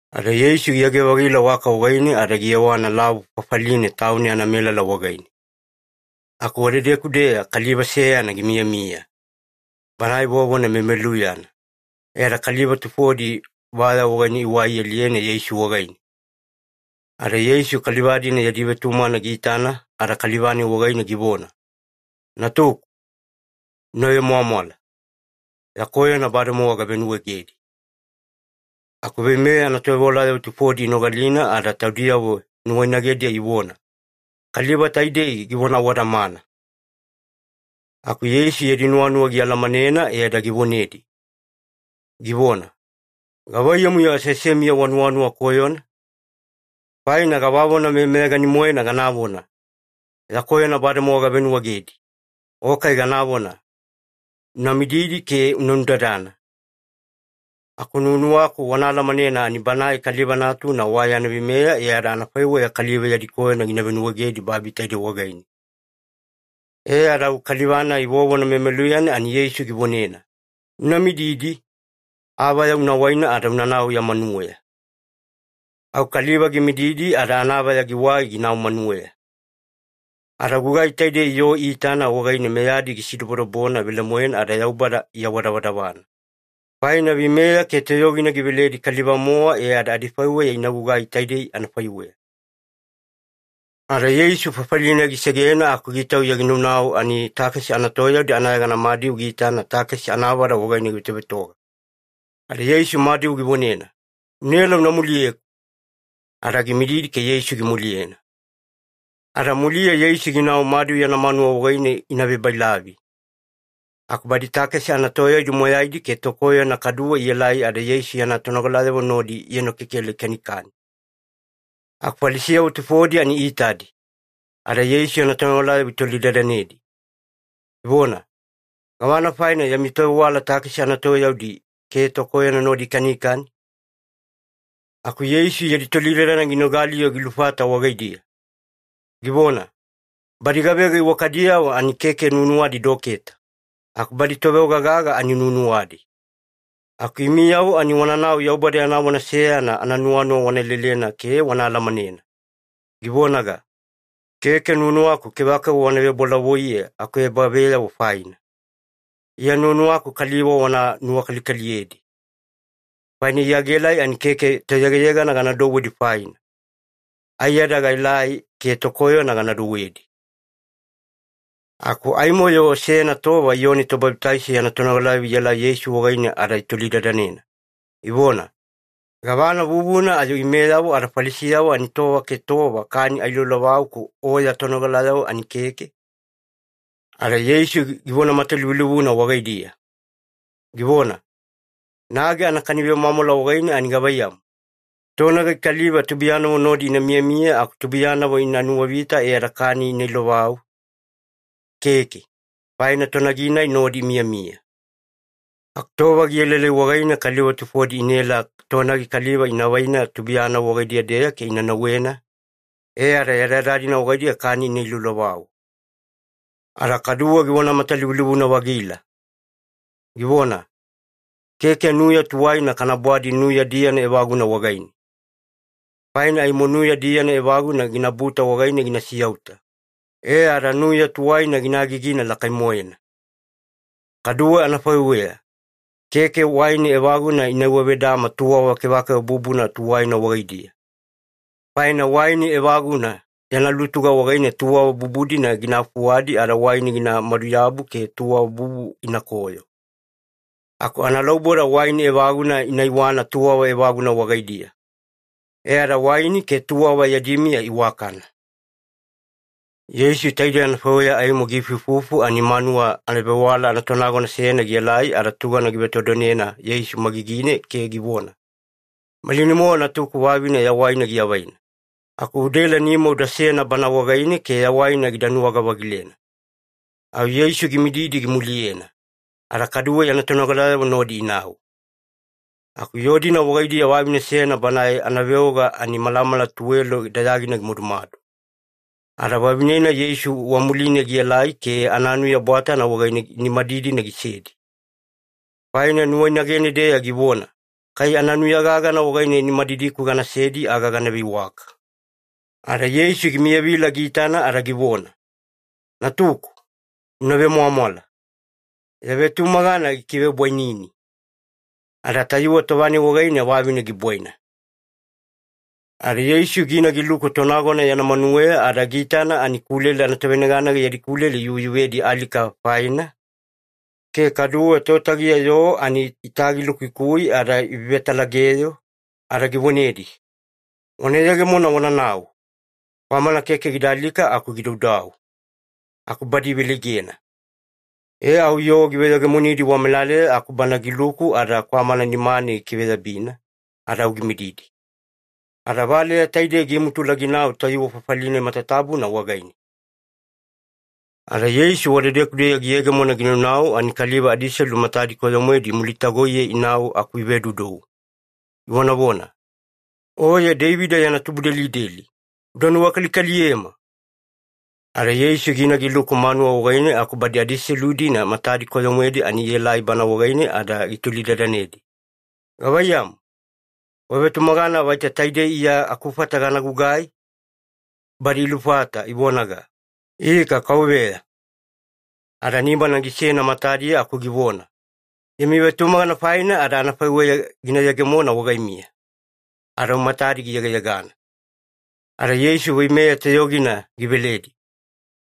Ada Yeisu giyage-vagila waka wagaine ada giyewana lavu fafaline tauna yana melala wagaine. Aku wadedeku-deya kaliva seyana gimiyamiya, banae vovona memeluyana, e ada kaliva tufodi vaya wagaine iwai ialiyena Yeisu wagaine. Ada Yeisu kaliva-dina yadi vetumagana giitana ada kaliva-nai wagaine givona, “Natuku, una vemwamwala. Ya koyona bademowa gavenuwaegedi.” Aku veimeya anatovewalayavo tufodi inogalina ada taudiyavo nuwainagediya ivona, “Kaliva taidei givona awadamana.” Aku Yeisu yadi nuwanuwa gialamanena e ada givonedi, givona, “Gavaiyamu-yo aseasemiya wanuwanuwa koyona? Faina gavavona meyameyagani-moena ganavona, ‘Ya koyona bademowa gavenuwaegedi’, o kai ganavona, ‘Una mididi ke una nudadana’? Aku nuwanuwaku wana alamanena ani Banae Kaliva Natuna wa yana veimeya, e ada anafaiweya kaliva yadi koyona gina venuwaegedi babi taidei wagaine.” E ada au kaliva-nai vovona memeluyana ani Yeisu givonena, “Una mididi, avaya una waina ada unanau ya manuweya.” Au kaliva gimididi ada anavaya giwai ginau manuweya. Ada gugai taidei yoo iitana wagaine meyadi gisidobodobona velemoena ada Yaubada iawadavadavana, faina veimeya ke toyogina giveledi kaliva-mowa e ada adifaiweya ina gugai taidei anafaiweya. Ada Yeisu fafali-nai gisegena aku gitauya ginaunau ani takesi anatoyaudi anayegana Madiu giitana takesi anavada wagaine givetovetoga. Ada Yeisu Madiu givonena, “Unaela una muliyeku.” Ada gimididi ke Yeisu gimuliyena. Ada muliya Yeisu ginau Madiu yana manuwa wagaine ina vebailavi, aku badi takesi anatoyaudi moyaidi ke tokoyona kaduwe ielai, ada Yeisu yana tonogalayavo nodi ienokekela ikanikani. Aku Falisiyavo tufodi ani iitadi, ada Yeisu yana tonogalayavo itolidadanedi, ivona, “Gavana faina yami tovewala takesi anatoyaudi ke tokoyona nodi ikanikani?” Aku Yeisu yadi tolidadana ginogali-yo gilufata wagaidiya, givona, “Badi gavega iwakadiyavo ani keke nuwanuwadi doketa, aku badi toveoga-gaga ani nuwanuwadi. Aku imiyavo ani wananau Yaubada yana vona seyana ananuwanuwa wana lelena ke wana alamanena, givonaga, ‘Keke nuwanuwaku kevakeva wana vebolavoiye akuebaveyavo faina. Iya nuwanuwaku kaliva wana nuwakalikaliyedi.’ Faina Iya gaelai ani keke toyegayegana gana douwedi faina. Aiyada gaelai ke tokoyona gana douwedi.” Aku aimo-yo seyana tova Iyoni Tobabitaiso yana tonogalayavo ielai Yeisu wagaine ada itolidadanena, ivona, “Gavana vuvuna ayo imeyavo ada Falisiyavo ani tova ke tova kani ailoilovau aku O ya tonogalayavo ani keke?” Ada Yeisu givona matalivulivuna wagaidiya, givona, “Nagi anakani vemwamwala wagaine ani gavaiyamu, tonagi kaliva tubuiyanavo nodi ina miyamiya aku tubuiyanavo ina nuwavita e ada kani ina ilovau? Keke, faina tonagi-nai nodi imiyamiya. Aku tova gielaelai wagaine kaliva tufodi inaela tonagi kaliva ina vaina tubuiyanavo wagaidiya-deya ke ina nauwena, e ada yadayada-dina wagaidiya kani ina iloilovau.” Ada kaduwe givona matalivulivuna-vagila, givona, “Keke nuya tuwaina kana bwadi nuya diyana evaguna wagaine. Faina aimo nuya diyana evaguna ginabuta wagaine gina siyauta, e ada nuya tuwaina gina agigina lakai-moena. Kaduwe anafaiweya, keke waini evaguna ina iwavedama tuwava kevakeva bubuna tuwaina wagaidiya. Faina waini evaguna yana lutuga wagaine tuwava bubu-dina gina fuwadi ada waini gina maduyabu ke tuwava bubu inakoyo. Aku analauboda waini evaguna ina iwana tuwava evaguna wagaidiya, e ada waini ke tuwava yadi miya iwakana.” Yeisu taidei anafaiweya aimo giifuifufu ani manuwa ebavewala anatonagona seyana gielai, ada tugana givetodonena Yeisu magigine ke givona, “Malinai-mowa natuku vavine yawaina giavaina. Aku udaela nima udasena bana wagaine ke yawaina gida nuwaga-vagilena.” Au Yeisu gimididi gimuliyena, ada kaduwe yana tonogalayavo nodi inau. Aku yoo-dina wagaidiya vavine seyana banae anaveoga ani malamala tuwelo dayagina gimadumadu. Ada vavine-nai Yeisu wamuline gielai, ke ananuya bwatana wagaine nimadidina gisedi. Faina nuwainagene-deya givona, “Kai ananuya gagana wagaine nimadidiku ganasedi, aga gana veiwaka.” Ada Yeisu gimiyavila giitana ada givona, “Natuku, una vemwamwala. Ya vetumagana gikivebwainini.” Ada tayuwe tova-nai wagaine vavine gibwaina. Ada Yeisu gina giluku tonagona yana manuweya, ada giitana ani kulele anatoveneganega yadi kulele iyuveyuvedi alika faina, ke kaduwe totagiya yoo ani itagilukuikui ada ivevetalageyo, ada givonedi, “Wana yegemona wananau. Kwamana keke gida alika aku gidaudau.” Aku badi iveleigena. E au yoo giveyegemonidi wamelaleya aku Bana giluku, ada kwamana nimane gikiveyabina ada au gimididi. Ada valeya taidei gimutula ginau tayuwe fafali-nai matatabuna wagaine. Ada Yeisu wadedeku-deya giyegemona ginaunau ani kaliva adiselu matadi koyo-moedi imulitagoiye inau aku ivedoudou, ivonavona, “Oye Deivida yana tubudelideli, uda nuwakalikaliyema!” Ada Yeisu gina giluku manuwa wagaine aku badi adiselu-dina matadi koyo-moedi ani ielai Bana wagaine, ada gitolidadanedi, “Gavaiyamu, wavetumagana vaita taidei Iya akufata gana gugai?” Badi ilufata ivonaga, “Ika Kauveya.” Ada nimana gisena matadiya aku givona, “Yami vetumagana faina ada anafaiweya gina yegemona wagaimiya.” Ada au matadi giyegayegana. Ada Yeisu veimeya toyogina giveledi,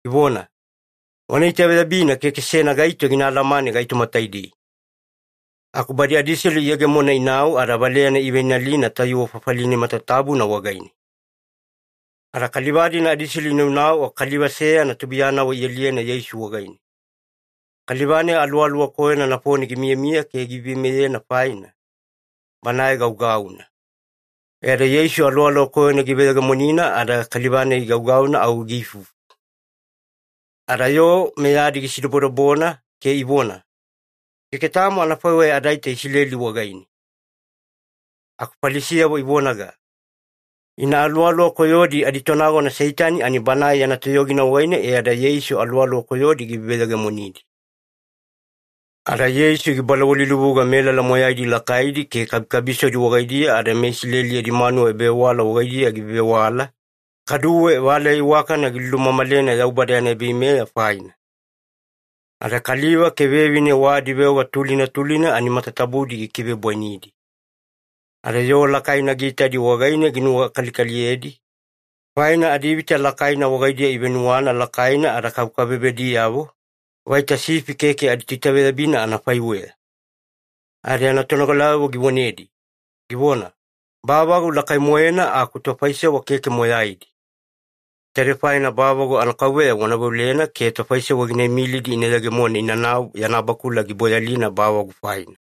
givona, “Wana itaveyabina keke seyana gaito gina alamane gaitoma taidei.” Aku badi adiselu iyegemona inau, ada valeyana iveinalina tayuwe fafali-nai matatabuna wagaine. Ada kaliva-dina adiselu inaunau aku kaliva seyana tubuiyanavo ialiyena Yeisu wagaine. Kaliva-nai aluwaluwa koyona nafone gimiyamiya ke giveiveimeyena faina, banae gaugauna. E ada Yeisu aluwaluwa koyona giveyegemonina ada kaliva-nai gaugauna au giifufu. Ada yoo meyadi gisidobodobona ke ivona, “Keke tamo anafaiweya adaita Isileli wagaine.” Aku Falisiyavo ivonaga, “Ina aluwaluwa koyodi aditonagona Seitani, ani banae yana toyogina wagaine e ada Yeisu aluwaluwa koyodi giveveyegemonidi.” Ada Yeisu gibalawalilivuga melala moyaidi lakaidi ke kabikabisodi wagaidiya, ada meIsileli yadi manuwa ebavewala wagaidiya givevewala, kaduwe valeya iwakana gilumamalena Yaubada yana ebaveimeya faina. Ada kaliva ke vevine wa adiveoga tulina tulina ani matatabudi gikivebwainidi. Ada yoo lakaina giitadi wagaine ginuwakalikaliyedi, faina adivita lakaina wagaidiya ivenuwana lakaina ada kabekabebediyavo, vaita sifi keke aditoitaveyabina anafaiweya. Ada yana tonogalayavo givonedi, givona, “Bavagu lakai-moena aku tofaisewa keke moyaidi. Taidei faina bavagu anaKauveya wana veolena ke tofaisewa gina imilidi ina yegemona inanau yana bakula giboyalina bavagu faina.”